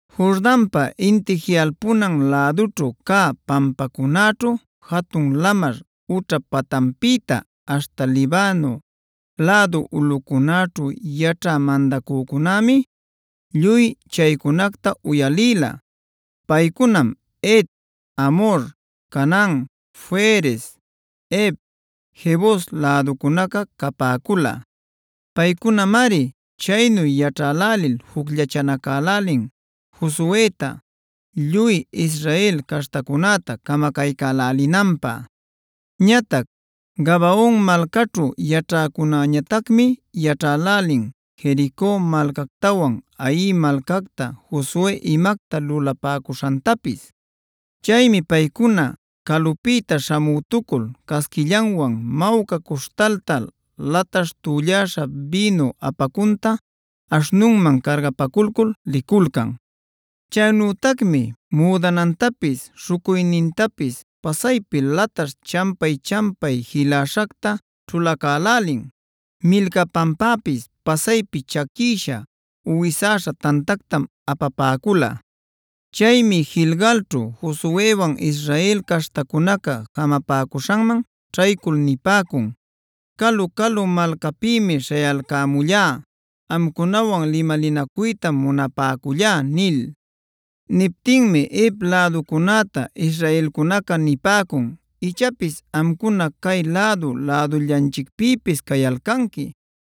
Jordanpa inti jiꞌalpunan lädućhu cä pampancunaćhu, jatun lamar ućhap patanpïta aśhta Libano lädu ulꞌucunäćhu yaćhä mandacücunämi lluy chaycunacta uyalïla. Paycunam Het, Amhor, Canaan, Ferez, Hev, Jebus läducunaca capäcula. Paycunamari chaynu yaćhälälil jucllachanacälälin Josueta, lluy Israel caśhtacunäta camacaycälälïnanpä. Ñatac Gabaon malcaćhu yaćhäcunäñatacmi yaćhälälin Jerico malcactawan Hai malcacta Josue imacta lulapäcuśhantapis. Chaymi paycuna calupïta śhamütucul casquillanwan mawca cuśhtalta, lataśh tülläśha bïnu apacunta aśhnunman cargapaculcul liculcan. Chaynütacmi müdanantapis, śhucuynintapis pasaypi lataśh champay-champay jiläśhacta ćhulacälälin. Milcapanpäpis pasaypi chaquïsha uwisäśha tantactam apapäcula. Chaymi Gilgalćhu Josuewan Israel caśhtacunaca jamapäcuśhanman ćhaycul nipäcun: “Calu-calu malcapïmi śhayalcämullá. Amcunawan limalinacuytam munapäcullá” nil. Niptinmi Hev läducunäta Israelcunaca nipäcun: “Ichapis amcuna cay lädu-lädullanchicpïpis cayalcanqui.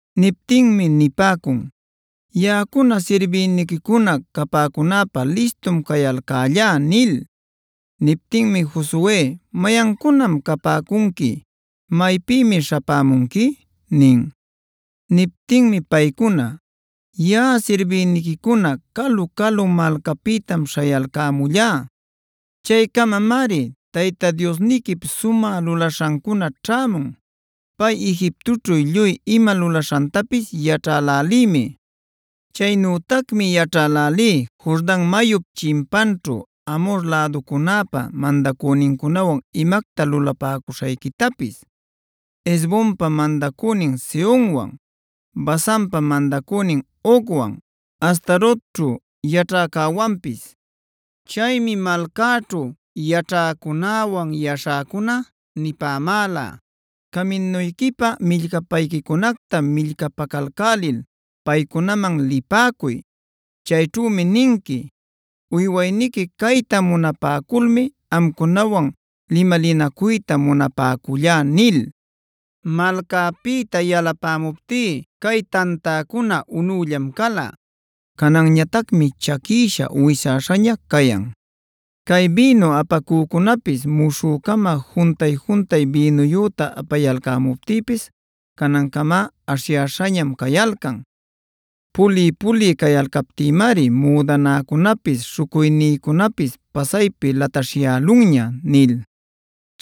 Niptinmi nipäcun: “Yaꞌacuna sirbïniquicuna capäcunäpä listum cayalcällá” nil. Niptinmi Josue: “¿Mayancunam capäcunqui, maypïmi śhapämunqui?” nin. Niptinmi paycuna: “Yaꞌa sirbïniquicuna calu-calu malcapïtam śhayalcämullá. Chaycamamari Tayta Diosniquip sumä lulaśhancuna ćhämun. Pay Egiptoćhu lluy ima lulaśhantapis yaćhälälïmi. Chaynütacmi yaćhälälí Jordan mayup chimpanćhu Amhor läducunäpa mandacünincunawan imacta lulapäcuśhayquitapis: Hesbonpa mandacünin Sehonwan, Basanpa mandacünin Ogwan, Astarotćhub yaćhäcäwanpis. Chaymi malcäćhu yaćhäcunäwan yaśhäcuna nipämäla: ‘Caminuyquipä millcapayquicunacta millcapacalcälil paycunaman lipäcuy. Chayćhümi ninqui: “Uywayniqui cayta munapäculmi amcunawan limalinacuyta munapäcullá” ’ nil. Malcäpïta yalapämuptí cay tantäcuna unüllam cala. Cananñatacmi chaquïsha uwisäśhaña cayan. Cay bïnu apacücunapis muśhü-cama juntay-juntay bïnuyüta apayalcämuptïpis canancamá aśhyäśhañamc cayalcan. Puliy-puliy cayalcaptïmari müdanäcunapis, śhucuynïcunapis pasaypi lataśhyälunña” nil.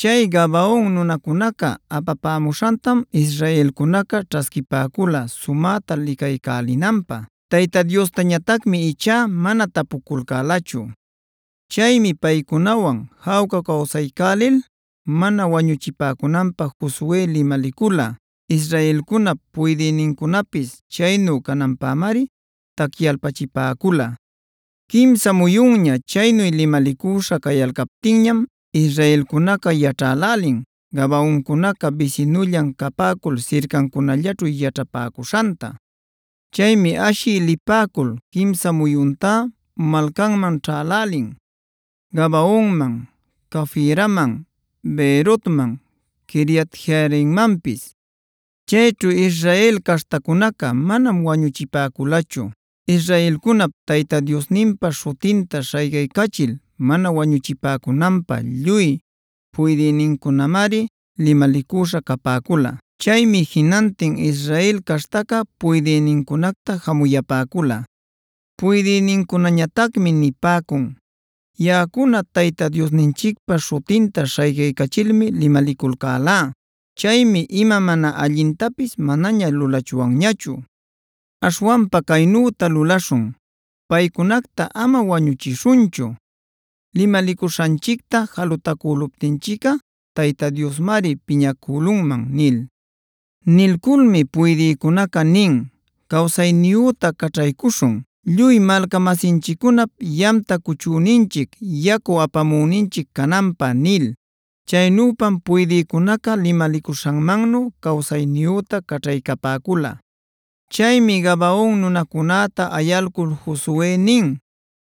Chay Gabaon nunacunaca apapämuśhantam israelcunaca ćhasquipäcula sumäta licaycälinanpä; Tayta Diostañatacmi ichá mana tapupäculachu. Chaymi paycunawan jawca cawsaycälil mana wañuchipäcunanpä Josue limalicula. Israelcunap puydïnincunapis chaynu cananpämari tacyalpachipäcula. Quimsa muyunña chaynu limalicüśha cayalcaptinñam israelcunaca yaćhälälin Gabaoncunaca bisinullan capäcul sircancunallaćhu yaćhapäcuśhanta. Chaymi ashï lipäcul quimsa muyuntá malcanman ćhälälin: Gabaonman, Cafiraman, Beerotman, Quiriat-jearimmanpis. Chayćhu Israel caśhtacunaca manam wañuchipäculachu. Israelcunap Tayta Diosninpa śhutinta śhaycaycachil mana wañuchipäcunanpä lluy puydïnincunamari limalicüśha capäcula. Chaymi jinantin Israel caśhtaca puydïnincunacta jamuyapäcula. Puydïcunäñatacmi nipäcun: “Yaꞌacuna Tayta Diosninchicpa śhutinta śhaycaycachilmi limaliculcälá. Chaymi ima mana allintapis manaña lulachwanñachu. Aśhwanpa caynüta lulaśhun: Paycunacta ama wañuchishunchu. Limalicuśhanchicta jalutacüluptinchicꞌa Tayta Diosmari piñacülunman” nil. Nilculmi puydïcunaca nin: “Cawsayniyüta caćhaycuśhun, lluy malca-masinchiccunap yamta cuchüninchic, yacu apamüninchic cananpä” nil. Chaynüpam puydïcunaca limalicuśhanmannu cawsayniyüta caćhaycapäcula. Chaymi Gabaon nunacunäta ayalcul Josue nin: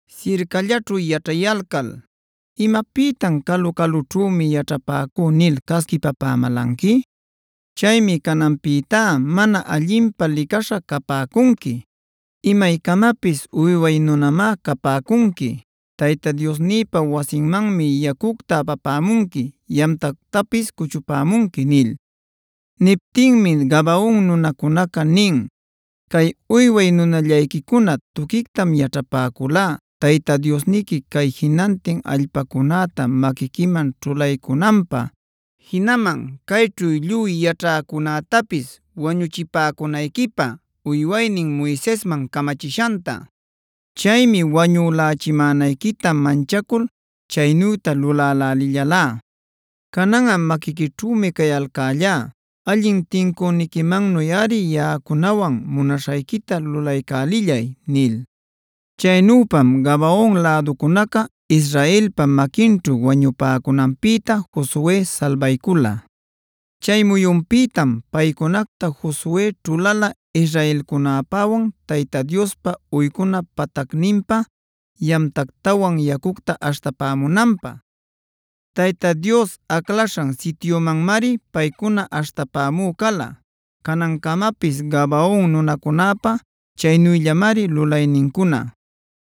“Sircallaćhu yaćhayalcal ¿imapïtam ‘calu-calućhümi yaćhapäcú’ nil casquipapämälanqui? Chaymi cananpïtá mana allinpä licaśha capäcunqui; imaycamapis uyway nunamá capäcunqui. Tayta Diosnïpa wasinmanmi yacucta apapämunqui, yamtactapis cuchupämunqui” nil. Niptinmi Gabaon nunacunaca nin: “Cay uyway nunallayquicuna tuquictam yaćhapäculá Tayta Diosniqui cay jinantin allpacunäta maquiquiman ćhulaycunanpä, jinaman cayćhu lluy yaćhäcunätapis wañuchipäcunayquipä uywaynin Moisesman camachishanta. Chaymi wañülächimänayquita manchacul chaynüta lulälälillalá. Cananꞌa maquiquićhümi cayalcällá. Allin tincüniquimannuꞌari yaꞌacunawan munaśhayquita lulaycälillay” nil. Chaynüpam Gabaon läducunaca Israelpa maquinćhu wañupäcunanpïta Josue salbaycula. Chay muyunpïtam paycunacta Josue ćhulala israelcunäpäwan Tayta Diospa uycuna patacninpä yamtactawan yacucta aśhtapämunanpä. Tayta Dios aclaśhan sityumanmari paycuna aśhtapämü cala. Canancamapis Gabaon nunacunäpa chaynüllamari lulaynincuna.